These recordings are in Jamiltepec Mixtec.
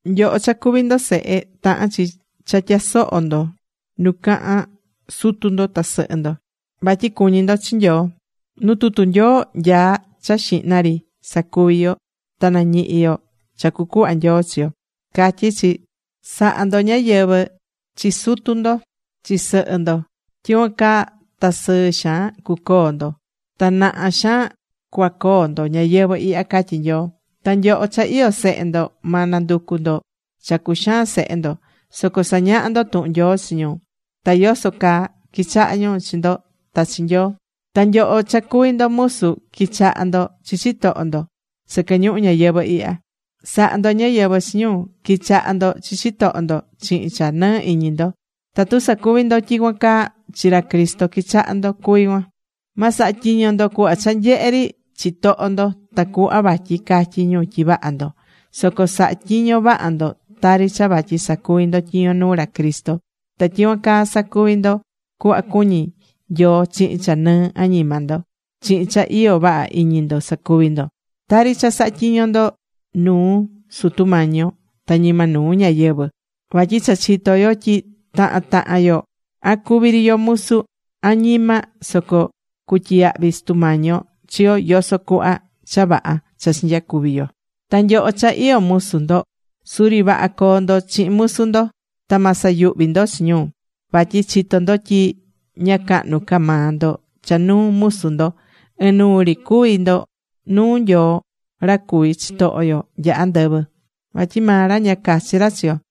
Nyoho cha cuví ndo sehe, tahán chi cha tya̱soho ndo nu cahán sutu ndo ta sɨhɨ ndo. Vatyi cuñí ndo chi Nyoo. Nu tutu Nyoo nyaá cha xihna ri sacuvi yo ta nañihi yo cha cucuhva Nyoo chi yo. Catyí chi: “Sa̱ha ndo ñáyɨvɨ chi sutu ndo, chi sɨhɨ ndo. Tyicuan caa ta sɨɨ xaan cuacoo ndo. Ta naha xaan cuacoo ndo ñayɨvɨ̱ ihya”, catyí Nyoo. Ta nyoho cha iyó sehe ndo, ma nanducu ndo cha cuxaan sehe ndo. Soco sa̱ñaha ndo tuhun Nyoo chi ñu, ta yoso caa quichaha ñu chi ndo ta chi Nyoo. Ta nyoho cha cuví ndo musu, qui̱chaha ndo chi chitoho ndo sɨquɨ ñuhu ñayɨvɨ̱ ihya. Sa̱ha ndo ñáyɨvɨ chi ñu. Qui̱chaha ndo chi chitoho ndo chihin cha nɨɨ iñi ndo. Tatu sacuví ndo tyicuan caa, chi ra Cristo quichahá ndo cuví cuan. Ma saha tyiño ndo cuhva cha nyehe ri chitoho ndo tacuhva vatyi catyi ñu tyi vaha ndo. Soco sa̱ha tyiño vaha ndo tari cha vatyi sacuví ndo tyiño nuu ra Cristo. Ta tyicuan caa sacuví ndo cuhva cuñí Nyoo chihin cha nɨɨ añima ndo. Chihin cha iyó vaha iñi ndo sa̱cuvi ndo. Tari cha sahá tyiño ndo nuu Sutu Mañi yo ta ñima nuu ñáyɨvɨ. Vatyi cha chitó yo tyi tahan tahan yo, an cuví ri yo musu, an ñima, soco cutyiyahvi Sutu Mañi yo chi yo yoso cuhva cha vaha cha chinyacuvi̱ yo. Ta nyoho cha iyó musu ndo, suri vaha co̱o ndo chihin musu ndo. Ta ma sayuhvi ndo chi ñu. Vatyi chitó ndo tyi ña cahnu ca maa ndo cha nuu musu ndo. Inuu ri cuví ndo nuu Nyoo ra cuví chitoho yo nya andɨvɨ. Vatyi maa ra ña cachi ra chi yo.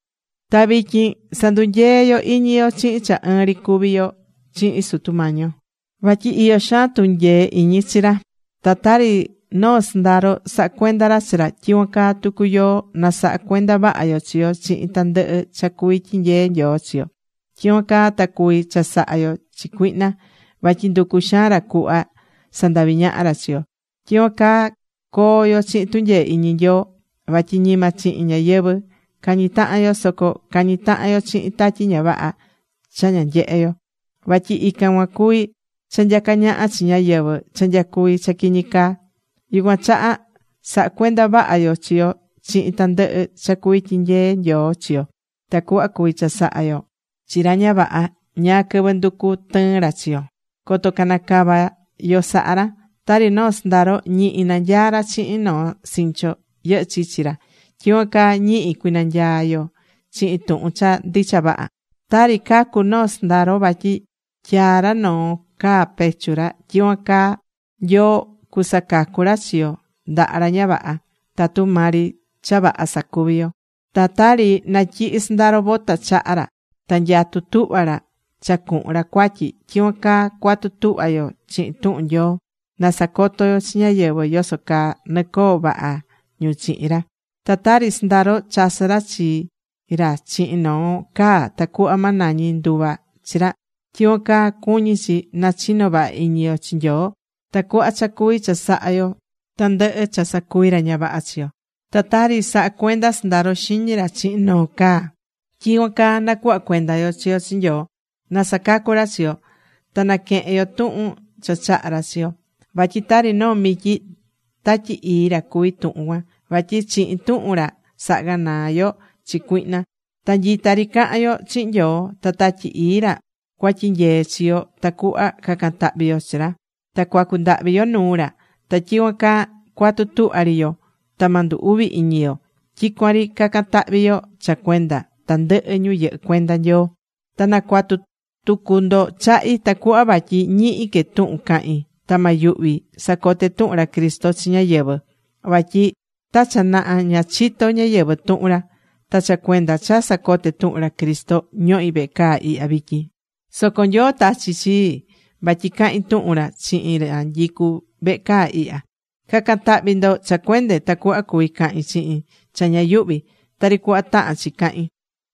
Ta vityin sa̱ndunyee yo iñi yo chihin cha ɨɨn ri cuví yo chihin Sutu Mañi yo. Vatyi iyó xaan tunyee iñi chi ra. Ta tari noo sɨndaro sahá cuenda ra chi ra, tyicuan caa tucu yoó, na̱saha cuenda vaha yo chi yo chihin tandɨhɨ cha cuvi tyinyee Nyoo chi yo. Tyicuan caa ta cuvi chasaha yo chi cuihna. Vatyi nducú xaan ra cuhva sandavi ñaha ra chi yo. Tyicuan caa coo yo chihin tunyee iñi Nyoo. Vatyi ñima chihin ñáyɨvɨ cañí tahan yo. Soco cañí tahan yo chihin tatyi ña vaha cha ña nyehé yo. Vatyi ican cuan cuví cha nyacá ñaha chi ñáyɨvɨ cha nyacuví cha quiñi caa. Yucuan chaha sa̱ha cuenda vaha yo chi yo chihin tandɨhɨ cha cuví tyinyee Nyoo chi yo, tacuhva cuvi chasaha yo chi ra ña vaha ñáá quɨvɨ nducu tɨɨn ra chi yo. Coto cana cava yo saha ra. Tari noo sɨndaro ñihi nanyaá ra chihin noo sincho yɨhɨ́ chichi ra, tyicuan caa ñihi cui̱nanyaa yo chihin tuhun cha ndicha vaha. Tari cacú noo sɨndaro vatyi tyaá ra noo caa pecho ra, tyicuan caa Nyoo cusacacu ra chi yo ndaha ra ña vaha, tatu maa ri cha vaha sacuvi yo. Ta tari natyihi sɨndaro bota chaha ra ta nyatú tuhva ra cha cuhun ra cuatyi, tyicuan caa cuatu tuhva yo chihin tuhun Nyoo. Na sacoto yo chi ñáyɨvɨ yoso caa nɨcoo vaha ñu chihin ra. Ta tari sɨndaro chasɨ́ ra chi ra chihin noo caa tacuhva ma nañi nduva chi ra, tyicuan caa cuñí chi nachino vaha iñi yo chi Nyoo tacuhva cha cuvi chasaha yo tandɨhɨ cha sacuvi ra ña vaha chi yo. Ta tari sahá cuenda sɨndaro xiñi ra chihin noo caa, tyicuan caa nacuhva cuenda yo chi yo chi Nyoo, na sacacu ra chi yo. Ta naquehen yo tuhun cha chahá ra chi yo. Vatyi tari noo mityi Tatyi Ii ra cuví tuhun cuan. Vatyi chihin tuhun ra sahá ganaa yo chi cuihna. Ta nyita ri cahan yo chihin Nyoo. Ta Tatyi Ii ra cuatyinyee chi yo tacuhva cacan tahvi yo chi ra. Ta cuacu ndahvi yo nuu ra. Ta tyicuan caa cua̱tu tuhva ri yo. Ta ma ndu uvi iñi yo. Tyicuan ri ca̱can tahvi yo cha cuenda tandɨhɨ ñu yɨhɨ́ cuenda Nyoo. Ta na̱cuatu tucu ndo chahi, tacuhva vatyi ñihi que tuhun cahin. Ta ma yuhvi sacote tuhun ra Cristo chi ñáyɨvɨ. Vatyi ta cha naha ña chito̱ ñáyɨvɨ tuhun ra. Ta cha cuenda cha sacoté tuhun ra Cristo ñohí vehe caa ihya vityin. Soco Nyoo tachi̱ chii vatyi cahin tuhun ra chihin ra nyicú vehe caa ihya. Ca̱can tahvi ndo cha cuende, tacuhva cuvi cahin chihin cha ña yuhví, tari cuhva tahán chi cahin.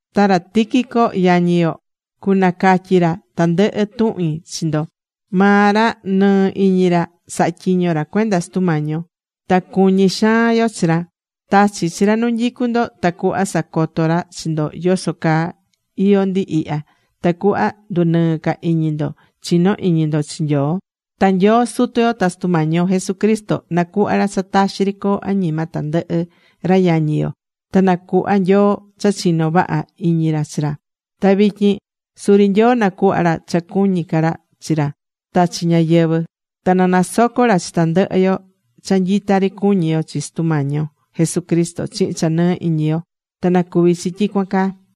Ta ra Tíquico yañi yo, cunacatyi ra tandɨhɨ tuhin chi ndo. Maa ra nɨɨ iñi ra sahá tyiño ra cuenda Sutu Mañi yo. Ta cuñi xaan yo chi ra. Tachí chi ra nu nyicú ndo tacuhva sacoto ra chi ndo yoso caa iyó ndi ihya, tacuhva ndunɨɨ ca iñi ndo chino iñi ndo chi Nyoo. Ta Nyoo Sutu yo ta Sutu Mañi yo Jesucristo nacuhva ra cha taxi ri coo añima tandɨhɨ ra yañi yo. Ta na cuhva Nyoo cha chinó vaha iñi ra chi ra. Ta vityin suri Nyoo na̱cuhva ra cha cuñí ca ra chi ra ta chi ñáyɨvɨ. Ta na nasoco ra chi tandɨhɨ yo cha nyita ri cuñí yo chi Sutu Mañi yo Jesucristo chihin cha nɨɨ iñi yo. Ta na̱cuvi chi tyicuan caa.